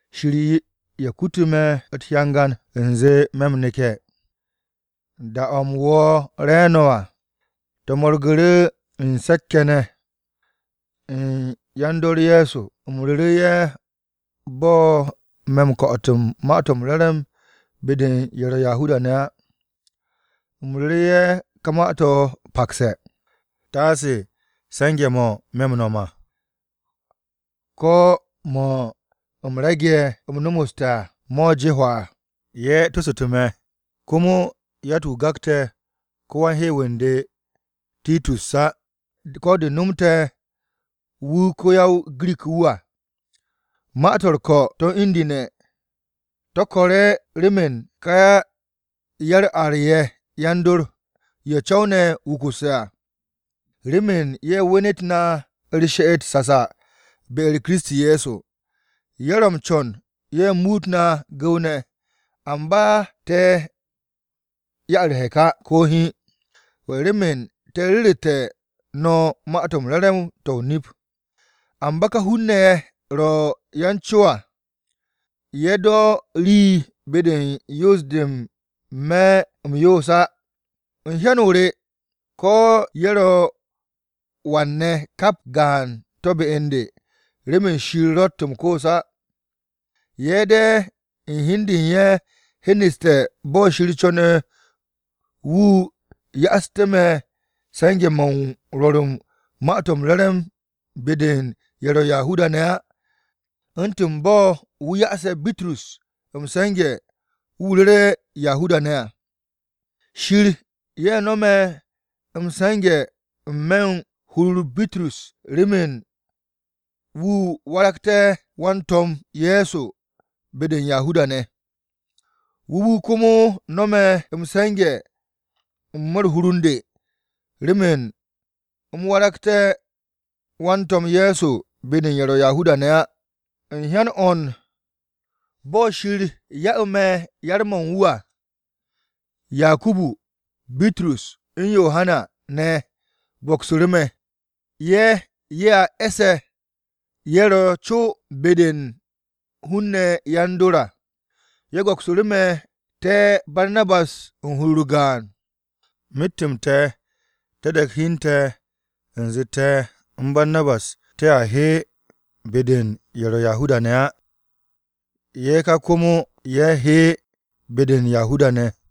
Shir ye̱ kutu̱ me̱ u̱t-hyangan u̱nze u̱m neke̱. Da-o̱ u̱m wo̱o̱ re̱e̱no̱ à, te̱ mo̱rgu̱ru̱ u̱n se̱k-ye̱ ne̱ u̱n yan-dor Ye̱so. U̱m ru̱ru̱ ye̱ bo̱ me̱ m-ko̱'o̱t u̱n Ma-to̱ m-Re̱re̱m be-de u̱n ye̱ ro̱ Yahuda-ne̱ á. U̱m ru̱ru̱ ye̱ ka ma-to̱ pakse̱, taase se̱nge̱-mo̱ me̱ m-no̱m à, ko̱ mo̱ u̱m rege̱ u̱m nomoste̱ à, mo̱ je hwaa. Ye̱ tosu̱tu̱ me̱, komo yatt-wu̱ gakte̱ á ko-wan-hew wu̱ u̱n de Titus á, ko̱ de̱ nomte̱ wu̱ ko-ya-o-Girik wu̱ à. Ma-to̱ u̱r-ko̱ to̱ u̱n indu̱ne̱, remen ka ya-u̱r-ar ye̱ yan-dor, ye̱ co̱w ne̱ wukusse̱ à, remen ye̱ wenet na u̱r-she'et sasa be-u̱r Kiristi Ye̱so. Ye̱ ro m-co̱n ye̱ muut na gu̱w-ne̱. Amba te̱ 'ya ye̱ u̱r-hek á, ko̱ hiin. Remen te̱ ru̱ru̱tú̱ no̱ Ma-to̱ m-Re̱re̱m to̱ o-nip. Amba ka hun-ne̱ ye̱ ro̱ yan-co à, ye̱ do̱ rii be-de u̱n yoos-de me̱ m-yoos á. (U̱n hyan-o re ko̱ ye̱ ro̱ wan-ne̱ kap gaan to̱ be u̱n de, remen Shir ro̱tt m-koos á.) Ye̱ de̱ u̱n hi u̱n de u̱n ye̱ hyeneste̱ bo̱ Shir co̱ne̱ wu̱ ya'astu̱ me̱ se̱nge̱-mo̱ u̱n rwo̱r u̱n Ma-to̱ m-Re̱re̱m be-de u̱n ye̱ ro̱ Yahuda-ne̱ á, u̱ntu̱n bo̱ wu̱ ya'ase̱ Bitrus m-se̱nge̱ wu̱ ru̱re̱ Yahuda-ne̱ à. Shir no̱me̱ m-se̱nge̱ n-me̱ u̱n hur-u̱r Bitrus remen wu̱ waragté̱ wan-To̱m Ye̱so be-de u̱n Yahuda-ne̱ à, wu̱ wu̱ komo no̱me̱ m-se̱nge̱ n-me̱ u̱n hur-u̱r u̱n de remen u̱m waragté̱ wan-To̱m Ye̱so be-de u̱n ye̱ ro̱ Yahuda-ne̱ á. U̱n hyan o̱ u̱n bo̱ Shir ya'u̱ me̱ yar-mo̱ u̱n wu̱ à, Yakubu, Bitrus u̱n Yohana ne̱ go̱ksu̱ru̱ me̱. Ye̱, ye̱ a e̱sse̱ ye̱ ro̱ co be-de u̱n hun-ne̱ yan-dor Ye̱so à, ye̱ go̱ksu̱ru̱ te̱ te̱ Barnabas u̱n hur-u̱r gaan. Myet-m te̱, te̱ de̱k hi u̱n te̱ u̱nze te̱ u̱n Barnabas te̱a he be-de u̱n ye̱ ro̱ Yahuda-ne̱ á. Ye̱ ká komo ye̱ he be-de u̱n Yahuda-ne̱.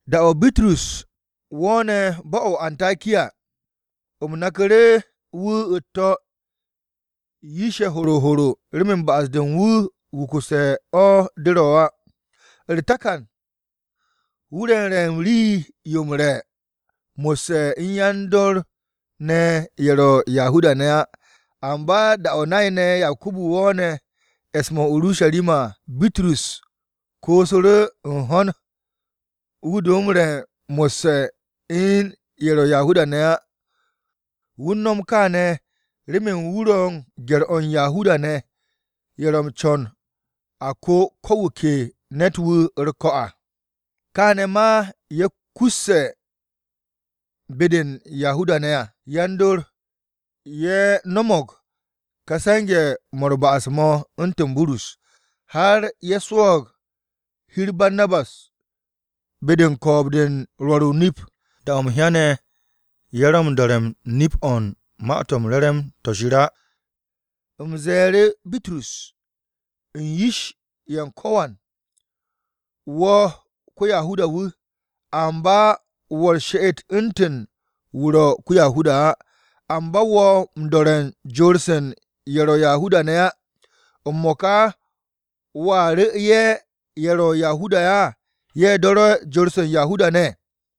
Da-o̱ Bitrus wo̱o̱ne̱ bo̱-o̱ o-Antakiya, u̱m naku̱ru̱ wu̱ u̱t-to̱ yish-ye̱ horo horo remen ba'as-de u̱n wu̱ wukusse̱ o̱ de ro̱ á. U̱r-takan, wu̱ ro m-re̱ u̱n rii-yo m-re̱ mo̱sse̱ u̱n yan-dor ne̱ ye̱ ro̱ Yahuda-ne̱ á. Amba da-o̱ nay-ne̱ Yakubu wo̱o̱ne̱ e̱s-mo̱ o-Urusharima à, Bitrus koosu̱ru̱ u̱n ho̱n wu̱ do m-re̱ mo̱sse̱ u̱n ye̱ ro̱ Yahuda-ne̱ ne̱ á. Wu̱ u̱n no̱m kaane̱ remen wu̱ ro̱ u̱n gye̱r-o̱ u̱n Yahuda-ne̱ ye̱ ro̱ m-co̱n a ko ko̱ wu̱ ke ne̱t-wu̱ u̱r-ko̱ à. Kaane̱ ma ye̱ kusse̱ be-de u̱n Yahuda-ne̱ à yan-dor ye̱ no̱mo̱g ka se̱nge̱-mo̱ u̱r-ba'as mo̱ u̱ntu̱n Bitrus, har ye̱ swo̱o̱g hi-u̱r Barnabas be-de u̱n ko̱o̱b-de u̱n rwo̱r o-nip. Da-o̱ u̱m hyane̱ ye̱ ro̱ m-do̱re̱ nip-o̱ u̱n Ma-to̱ m-Re̱re̱m to̱ Shir á, u̱m ze̱e̱ru̱ Bitrus u̱n yish-ye̱ u̱n ko̱wan. “Wo̱ ko-Yahuda-wu̱, amba wo̱ u̱r-she'et u̱ntu̱n wu̱ ro̱ ko-Yahuda á. Amba wo̱ m-do̱re̱ u̱n jor-se ye̱ ro̱ u̱n Yahuda-ne̱ á. ¿M-mo̱ka wo̱a ru̱ ye̱ ro̱ Yahuda-ne̱ á ye̱ do̱re̱ jor-se u̱n Yahuda-ne̱?”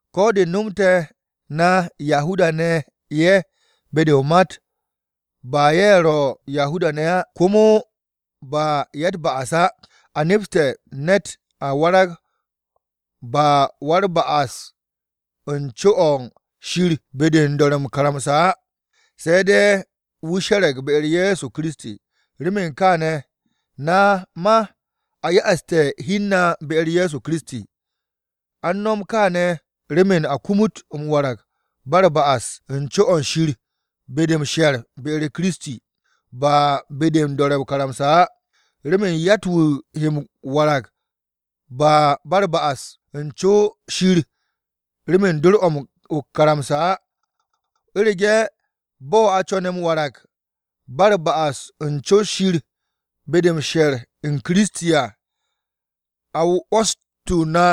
“Ko̱ de̱ nomte̱ na Yahuda-ne̱ ye̱ be-de o-mat, ba ye̱ ro̱ Yahuda-ne̱ á, komo ba ‘ya-u̱t-ba'as’ á, a nepse̱ ne̱t a warag ba u̱r-ba'as u̱n co-o̱ Shir be-de u̱n do̱re̱ o-karamsa á, se̱ de̱ wu̱ she̱re̱g be-u̱r Ye̱so Kiristi. Remen kaane̱, na ma a ya'aste̱ hi u̱n na be-u̱r Ye̱so Kiristi. A u̱n no̱m kaane̱ remen a kumut m-warag ba u̱r-ba'as u̱n co-o̱ Shir be-de m-she̱r be-u̱r Kiristi, ba be-de m-do̱re̱ o-karamsa á. Remen yatt-wu̱ he m-warag ba u̱r-ba'as u̱n co-o̱ Shir remen dor-o̱ o-karamsa á. “U̱rege̱, bo̱ a co̱ne̱ m-warag ba u̱r-ba'as u̱n co-o̱ Shir be-de m-she̱r u̱n Kiristi à, a 'wo̱stu̱ na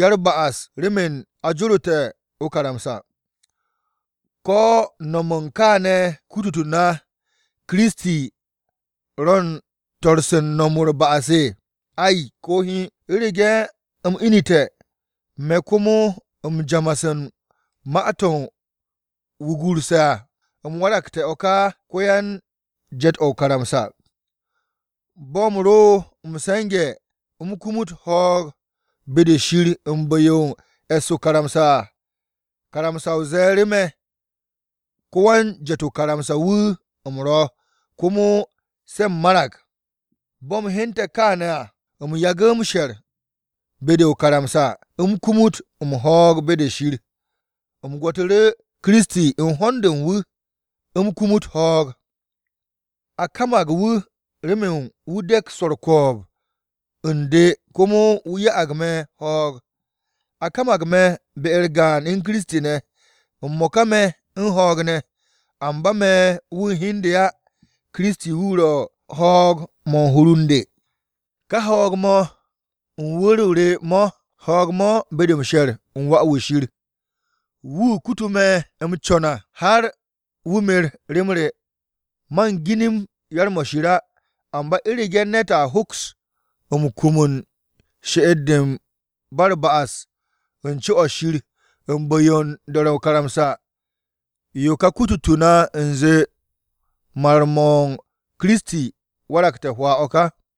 ya-u̱r-ba'as remen a jorote̱ o-karamsa, ¿ko̱ no̱m u̱n kaane̱ kututu̱ na Kiristi ro̱ u̱n to̱r-se u̱n no̱m u̱r-ba'as? Ay, ko̱ hiin! U̱rege̱ u̱m inu̱te̱, me̱ komo m-jamas u̱n ma-to̱ u̱m wugurse̱ à, u̱m waragte̱ o̱ ka ko-yan-je̱t o-karamsa. Bo̱ u̱m ro m-se̱nge̱ u̱m kumut ho̱o̱g be-de Shir u̱n bu̱-yo u̱n e̱ss o-karamsa à, karamsa ze̱e̱ru̱ me̱, ko-wan-je̱t o-karamsa wu̱ u̱m ro̱ komo se̱ u̱m marag. Bo̱ u̱m hyente̱ kááne̱ à, u̱m yagu̱ m-she̱r be-de o-karamsa u̱m kumut m-ho̱o̱g be-de Shir. U̱m gwo̱tu̱ru̱ Kiristi u̱n hond de u̱n wu̱ u̱m kumut ho̱o̱g. A kamag wu̱ remen wu̱ de̱k swo̱ u̱r-ko̱o̱b u̱n de komo wu̱ ya'ag me̱ ho̱o̱g. A kamag me̱ be-u̱r gaan u̱n Kiristi ne̱. M-mo̱ka me̱ u̱n ho̱o̱g ne̱, amba me̱ wu̱ u̱n hi u̱n de á. Kiristi wu̱ ro̱ ho̱o̱g-mo̱ u̱n hur u̱n de. Ka ho̱o̱g-mo̱ u̱n wu̱r-o re mo̱, ho̱o̱g-mo̱ be-de m-she̱r u̱n Wà-wu̱ Shir. Wu̱ kutu̱ me̱ m-co̱n à har wu̱ mer rem re. Man ginim yar-mo̱ Shir á. Amba u̱rege̱ ne̱t a hoks m-kum u̱n she'et-de ba u̱r-ba'as u̱n co-o̱ Shir u̱n bu̱-yo u̱n do̱re̱ o-karamsa, yo ka kututu̱ na u̱nze mar-m Kiristi, waragte̱ hwaa o̱ ka.”